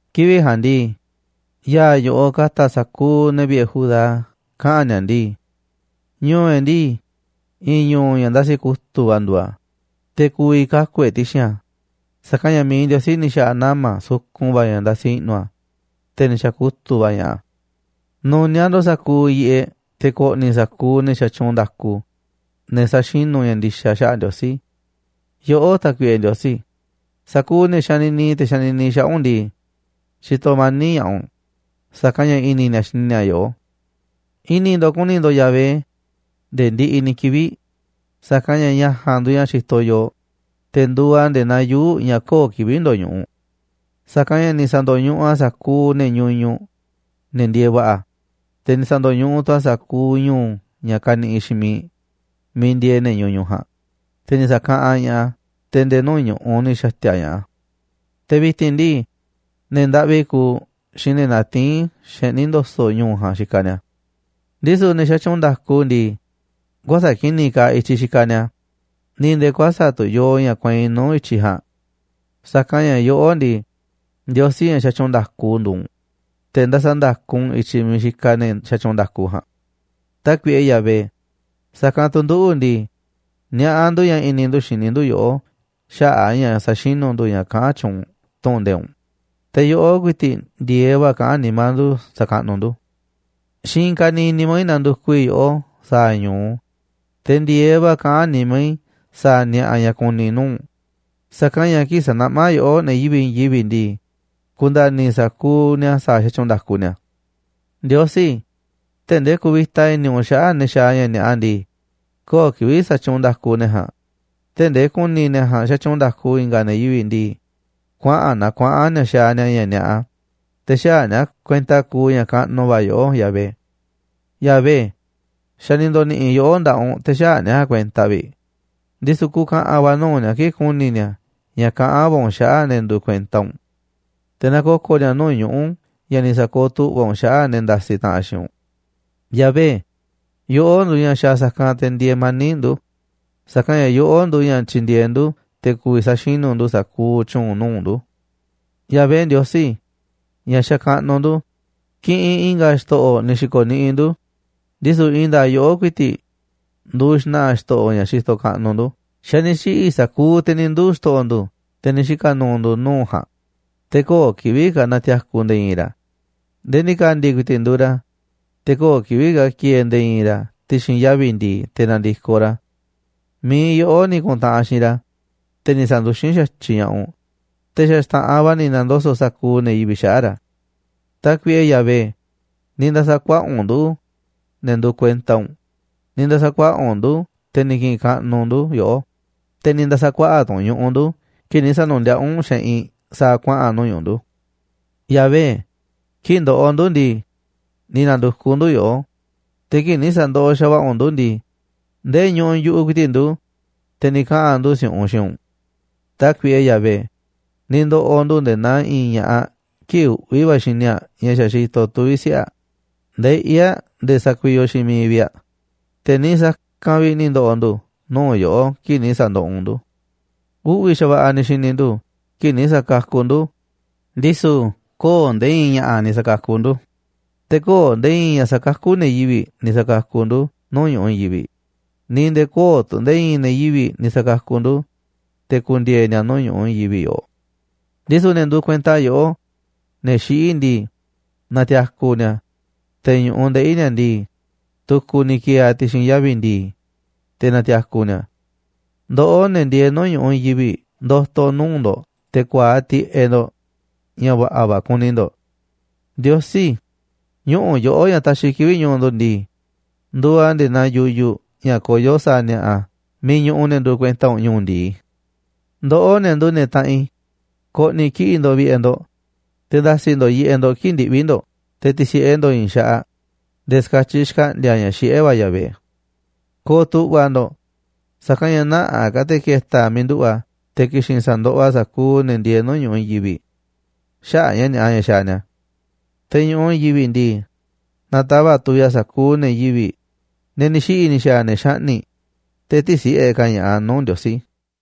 Kivi̱ꞌ ja̱a̱nꞌ ndii, ya̱a̱ yoꞌoꞌ ka̱ta̱ sa̱kuuꞌ ne̱ vi̱ꞌe̱ Judá kaꞌa̱n ni̱a̱ ndii: “Ñu̱u̱ e̱ꞌ ndii, i̱i̱n ñu̱u̱ ña̱ ndasi kutu̱ꞌ va̱ nduuꞌ a̱, te̱ ku̱vi̱ kaku̱ e̱ꞌ ti̱xi̱n a̱, sa̱kanꞌ ña̱ mi̱iꞌ Ndiosí ni̱ xa̱ꞌa̱ nama̱ sukun va̱ ña̱ ndasi i̱ꞌnu̱ a̱, te̱ ni̱ xa̱kutu̱ꞌ va̱ ña̱ꞌaꞌ a̱. Nu̱niaꞌ ndo̱ꞌ sa̱kuuꞌ yiꞌeꞌ te̱ ko̱ꞌni̱ sa̱kuuꞌ ne̱ xatyuunꞌ nda̱ku, ne̱ sa̱xinu̱ ña̱ ndi̱xa̱ xaꞌa̱ꞌ Ndiosí. Yoꞌó, Tákuiꞌe Ndiosí, sa̱kuuꞌ ne̱ xanini te̱ xanini xaꞌa̱ꞌ u̱nꞌ ndii, xitoꞌ mani̱ꞌ ña̱ꞌaꞌ u̱nꞌ, sa̱kanꞌ ña̱ i̱ni̱ ni̱a̱ xini ni̱a̱ yoꞌó. I̱ni̱ ndo̱ꞌ ku̱ni̱ ndo̱ꞌ Yahvé nde̱e̱ ndiꞌiꞌ ni̱ kivi̱ꞌ, sa̱kanꞌ ña̱ ña̱ ja̱a̱nꞌ nduuꞌ ña̱ xitoꞌ yooꞌ, te̱ nduuꞌ a̱ nde̱e̱ naa yuu̱ꞌ ña̱ köo̱ꞌ kivi̱ꞌ ndoñuꞌuꞌ. Sa̱kanꞌ ña̱ ni̱ sa̱ndo̱ñuꞌuꞌ a̱ sa̱kuuꞌ ne̱ ñuñuꞌ, ne̱ ndieeꞌ va̱ꞌa̱, te̱ ni̱ sa̱ndo̱ñuꞌuꞌ tu̱ a̱ sa̱kuuꞌ ñu̱u̱ ña̱ kaniꞌiꞌ xiinꞌ miiꞌ miiꞌ ndieeꞌ ne̱ ñuñuꞌ ja̱a̱nꞌ, te̱ ni̱ sa̱kaꞌanꞌ ña̱ꞌaꞌ a̱, te̱ nde̱e̱ nuu̱ꞌ ñu̱ꞌuꞌ ni̱ xa̱ti̱a̱ ña̱ꞌaꞌ a̱. Te̱ vi̱ti̱n ndii, ne̱ ndaꞌvi kuuꞌ xiinꞌ ne̱ natiín xeꞌní ndo̱so̱ꞌ ñu̱u̱ ja̱a̱nꞌ xikaꞌ ni̱a̱.” Ndisu̱ ne̱ xatyuunꞌ nda̱ku ndii, kuäsa̱ꞌ ki̱ni̱ kaaꞌ i̱tyiꞌ xikaꞌ ni̱a̱, ni̱ nde̱e̱ kuäsa̱ꞌ tu̱ yoo ña̱ kueinꞌ nuu̱ꞌ i̱tyiꞌ ja̱a̱nꞌ. Sa̱kanꞌ ña̱ yoꞌó ndii, Ndiosí ña̱ xatyuunꞌ nda̱ku nduuꞌ u̱nꞌ, te̱ ndasaꞌ nda̱ku u̱nꞌ i̱tyiꞌ miiꞌ xikaꞌ ne̱ xatyuunꞌ nda̱ku ja̱a̱nꞌ. Tákuiꞌe Yahvé, sa̱kanꞌ tu̱ nduꞌu̱ ndii, niaꞌá ndu̱ ña̱ i̱ni̱ ndu̱ xini ndu̱ yoꞌó xaꞌa̱ꞌ a̱ ña̱ sa̱xinu̱ ndu̱ ña̱ kaꞌán tyuunꞌ tu̱ꞌu̱n nde̱iꞌ u̱nꞌ, te̱ yoꞌó ku̱i̱ti̱ꞌ ndi̱e̱eꞌ va̱ kaꞌán nimá ndu̱ sa̱kaꞌnuꞌ ndu̱. Xiinꞌ i̱i̱n kaniiꞌ nimá i̱ nandukuꞌ i̱ yoꞌó sa̱a̱ ñu̱u, te̱ ndi̱e̱eꞌ va̱ kaꞌán nimá i̱ sa̱a̱ ni̱a̱ꞌa̱ ña̱ kuni ku̱ni̱ i̱ nuu̱ꞌ u̱nꞌ, sa̱kanꞌ ña̱ kii̱ꞌ sanaꞌmá yoꞌó ne̱ yivi̱ꞌ i̱i̱n yivi̱ꞌ ndii, ku̱nda̱ni̱ sa̱kuuꞌ ni̱a̱ sa̱a̱ sa̱tyuunꞌ nda̱ku ni̱a̱. Ndiosí, tee̱ꞌ ndee ku̱vi̱ta i̱ni̱ u̱nꞌ xaꞌa̱ꞌ ne̱ xaaꞌ ña̱ ni̱a̱ꞌa ndii, köo̱ꞌ kivi̱ꞌ sa̱tyuunꞌ nda̱ku ne̱ ja̱a̱nꞌ. Tee̱ꞌ ndee ku̱ni̱ ne̱ ja̱a̱nꞌ xatyuunꞌ nda̱ku i̱nga̱ ne̱ yivi̱ꞌ ndii, kuaꞌa̱n naa kuaꞌa̱n ni̱a̱ xaaꞌ ni̱a̱ ña̱ ni̱a̱ꞌa, te̱ xäaꞌ ni̱a̱ kuenta kuuꞌ ña̱ kaꞌnuꞌ va̱ yoꞌó, Yahvé. Yahvé, xa̱ ni̱ ndo̱ni̱ꞌi̱ yoꞌó nda̱ꞌaꞌ u̱nꞌ, te̱ xäaꞌ ne̱ ja̱a̱nꞌ kuenta vi̱ꞌ, ndisu̱ ku̱ka̱ꞌa̱n va̱ nuu̱ꞌ ni̱a̱ kii̱ꞌ ku̱ni̱ ni̱a̱ ña̱ kaꞌán va̱ u̱nꞌ xaꞌa̱ꞌ ne̱ nduuꞌ kuenta u̱nꞌ. Te̱ na ko̱ko̱ ni̱a̱ nuu̱ꞌ ñuꞌu̱ ña̱ ni̱ sa̱kooꞌ tu̱ꞌva̱ u̱nꞌ xaꞌa̱ꞌ ne̱ ndasiꞌ taꞌanꞌ xiinꞌ u̱nꞌ. Yahvé, yoꞌó nduuꞌ ña̱ xaaꞌ sa̱kanꞌ te̱ ndieeꞌ mani̱ꞌ ndu̱, sa̱kanꞌ ña̱ yoꞌó nduuꞌ ña̱ tyindieeꞌ ndu̱, te̱ ku̱vi̱ sa̱xinu̱ ndu̱ sa̱kuuꞌ tyu̱u̱n nuu̱ꞌ ndu̱. Yahvé, Ndiosí ña̱ xakaꞌnuꞌ ndu̱, kiꞌinꞌ i̱nga̱ xto̱ꞌo̱ ni̱ xi̱ko̱ niꞌiꞌ ndu̱, ndisu̱ i̱i̱n nda̱a̱ꞌ yoꞌó ku̱i̱ti̱ꞌ nduuꞌ xna̱ꞌa̱ xto̱ꞌo̱ ña̱ xitoꞌ kaꞌnuꞌ ndu̱. Xa̱ ni̱ xiꞌi̱ sa̱kuuꞌ te̱ ni̱ nduu̱ xto̱ꞌo̱ ndu̱, te̱ ni̱ xika̱ nu̱u̱ ndu̱ nuu̱ꞌ ja̱a̱nꞌ, te̱ köo̱ꞌ kivi̱ꞌ ka̱ na̱ti̱a̱ku̱ nde̱e̱ i̱i̱n ra̱ nde̱e̱ ndi̱ka̱ndi̱ ku̱i̱ti̱ꞌ nduuꞌ ra̱. Te̱ köo̱ꞌ kivi̱ꞌ ka̱ ki̱e̱e̱ nde̱e̱ i̱i̱n ra̱ ti̱xi̱n yavi̱ ndi̱i̱ te̱ na̱ndi̱koꞌ ra̱. Mi̱iꞌ yoꞌó ni̱ ku̱ntaꞌanꞌ xiinꞌ ra̱, te̱ ni̱ sa̱nduxín xa̱tyiꞌ ña̱ꞌaꞌ u̱nꞌ, te̱ xa̱ xta̱ꞌanꞌ va̱ ni̱ na̱ndoso̱ꞌ sa̱kuuꞌ ne̱ yivi̱ꞌ xaꞌa̱ꞌ ra̱. Tákuiꞌe Yahvé, ni̱ nda̱sa̱ kuaꞌa̱ꞌ u̱nꞌ nduꞌu̱, ne̱ nduuꞌ kuenta u̱nꞌ, ni̱ nda̱sa̱ kuaꞌa̱ꞌ u̱nꞌ ndu̱ te̱ ki̱ꞌi̱n kaꞌnuꞌ ndu̱ yoꞌó, te̱ ni̱ nda̱sa̱ kuaꞌa̱ꞌ ka̱ tu̱ u̱nꞌ ñu̱ꞌuꞌ ndu̱ kii̱ꞌ ni̱ sa̱nu̱ndiaꞌá u̱nꞌ xeꞌinꞌ sa̱a̱ kuaꞌa̱n nuu̱ꞌ ñu̱ꞌuꞌ ndu̱. Yahvé, kii̱ꞌ ndoꞌoꞌ ndu̱ ndii, ni̱ na̱ndu̱kuꞌ ndu̱ yoꞌó, te̱ kii̱ꞌ ni̱ sa̱ndoꞌoꞌ xa̱va̱ꞌa̱ u̱nꞌ ndu̱ ndii, ndee ñuꞌuꞌ yu̱ꞌuꞌ ku̱i̱ti̱ꞌ ndu̱, te̱ ni̱ kaꞌa̱n ndu̱ si̱u̱ꞌunꞌ xiinꞌ u̱nꞌ. Tákuiꞌe Yahvé, ni̱ ndo̱ꞌo̱ ndu̱ nde̱e̱ naa i̱i̱n ña̱ꞌaꞌ kii̱ꞌ uꞌvi̱ va̱ xini aꞌ ña̱ xa̱ xitoꞌ tuvi̱ siꞌe̱ aꞌ, ndeꞌí aꞌ nde̱e̱ sakuiyoꞌ xiinꞌ miiꞌ vi̱ꞌ aꞌ, te̱ niiꞌ sa̱kanꞌ vi̱ꞌ ni̱ ndo̱ꞌo̱ ndu̱ nuu̱ꞌ yoꞌó kii̱ꞌ ni̱ sa̱ndoꞌoꞌ u̱nꞌ ndu̱. Uꞌvi̱ xa̱va̱ꞌa̱ ni̱ xi̱ni̱ ndu̱ kii̱ꞌ ni̱ sa̱kakuꞌ ndu̱, ndisu̱ köo̱ꞌ nde̱e̱ i̱i̱n ña̱ꞌa̱ ni̱ sa̱kakuꞌ ndu̱, te̱ köo̱ꞌ nde̱e̱ i̱i̱n ña̱ sakakú ne̱ yivi̱ꞌ ni̱ sa̱kakuꞌ ndu̱ nuu̱ꞌ ñu̱ꞌuꞌ i̱i̱n yivi̱ꞌ, ni̱ nde̱e̱ köo̱ꞌ tu̱ nde̱e̱ i̱i̱n ne̱ yivi̱ꞌ ni̱ sa̱kakuꞌ ndu̱, te̱ ku̱ndi̱e̱e̱ ni̱a̱ nuu̱ꞌ ñu̱ꞌuꞌ i̱i̱n yivi̱ꞌ yoꞌoꞌ. Ndisu̱ ne̱ nduuꞌ kuenta yoꞌó, ne̱ xiꞌí ndii, na̱ti̱a̱ku̱ ni̱a̱. Te̱ ñu̱ꞌuꞌ ndeꞌi̱ ni̱a̱ ndii, tu̱ku̱ ni̱ ki̱e̱e̱ a̱ ti̱xi̱n yavi̱ ndi̱i̱, te̱ na̱ti̱a̱ku̱ ni̱a̱. Ndoꞌó, ne̱ ndieeꞌ nuu̱ꞌ ñu̱ꞌuꞌ i̱i̱n yivi̱ꞌ, ndo̱to̱ nuu̱ꞌ ndo̱ꞌ te̱ ku̱a̱aꞌ tiꞌeꞌ ndo̱ꞌ ña̱ va̱ꞌa̱ va̱ kuni ndo̱ꞌ. Ndiosí, ñuꞌu̱ yoꞌó ña̱ taxiꞌ kivi̱ꞌ ñu̱u̱ ndu̱ ndii, nduuꞌ a̱ nde̱e̱ naa yuyuꞌ ña̱ koyó sa̱a̱ ni̱a̱ꞌa̱ miiꞌ ñuꞌuꞌ ne̱ nduuꞌ kuenta u̱nꞌ ñu̱u̱ ndi̱i. Ndoꞌó, ne̱ nduuꞌ ne̱ taꞌanꞌ i̱, ko̱ꞌni̱ kiꞌi̱ꞌ ndo̱ꞌ vi̱ꞌe̱ ndo̱ꞌ, te̱ nda̱si̱ ndo̱ꞌ yiꞌeꞌ ndo̱ꞌ kii̱ꞌ ndiꞌvi̱ ndo̱ꞌ, te̱ ti̱si̱ꞌe ndo̱ꞌ i̱i̱n xaꞌaꞌ nde̱e̱ ska̱tyiꞌ xkaꞌndi̱a̱ ña̱ xiꞌé va̱ Yahvé. Ko̱o̱ tu̱ꞌva̱ ndo̱ꞌ, sa̱kanꞌ ña̱ nä̱ꞌaꞌ ka̱ te̱ ke̱ta̱ a̱ miiꞌ nduꞌu̱ꞌ a̱, te̱ ki̱xi̱n sa̱ndoꞌoꞌ a̱ sa̱kuuꞌ ne̱ ndieeꞌ nuu̱ꞌ ñu̱ꞌuꞌ i̱i̱n yivi̱ꞌ xaꞌa̱ꞌ ña̱ ni̱a̱ꞌa ña̱ xaaꞌ ni̱a̱. Te̱ ñu̱ꞌuꞌ i̱i̱n yivi̱ꞌ ndii, na̱tava̱ꞌ tuviꞌ a̱ sa̱kuuꞌ ne̱ yivi̱ꞌ, ne̱ ni̱ xiꞌi̱ ni̱ xa̱a̱ ne̱ xaꞌni̱ꞌ, te̱ tï̱si̱ꞌe ka̱ ña̱ꞌaꞌ a̱ nuu̱ꞌ Ndiosí.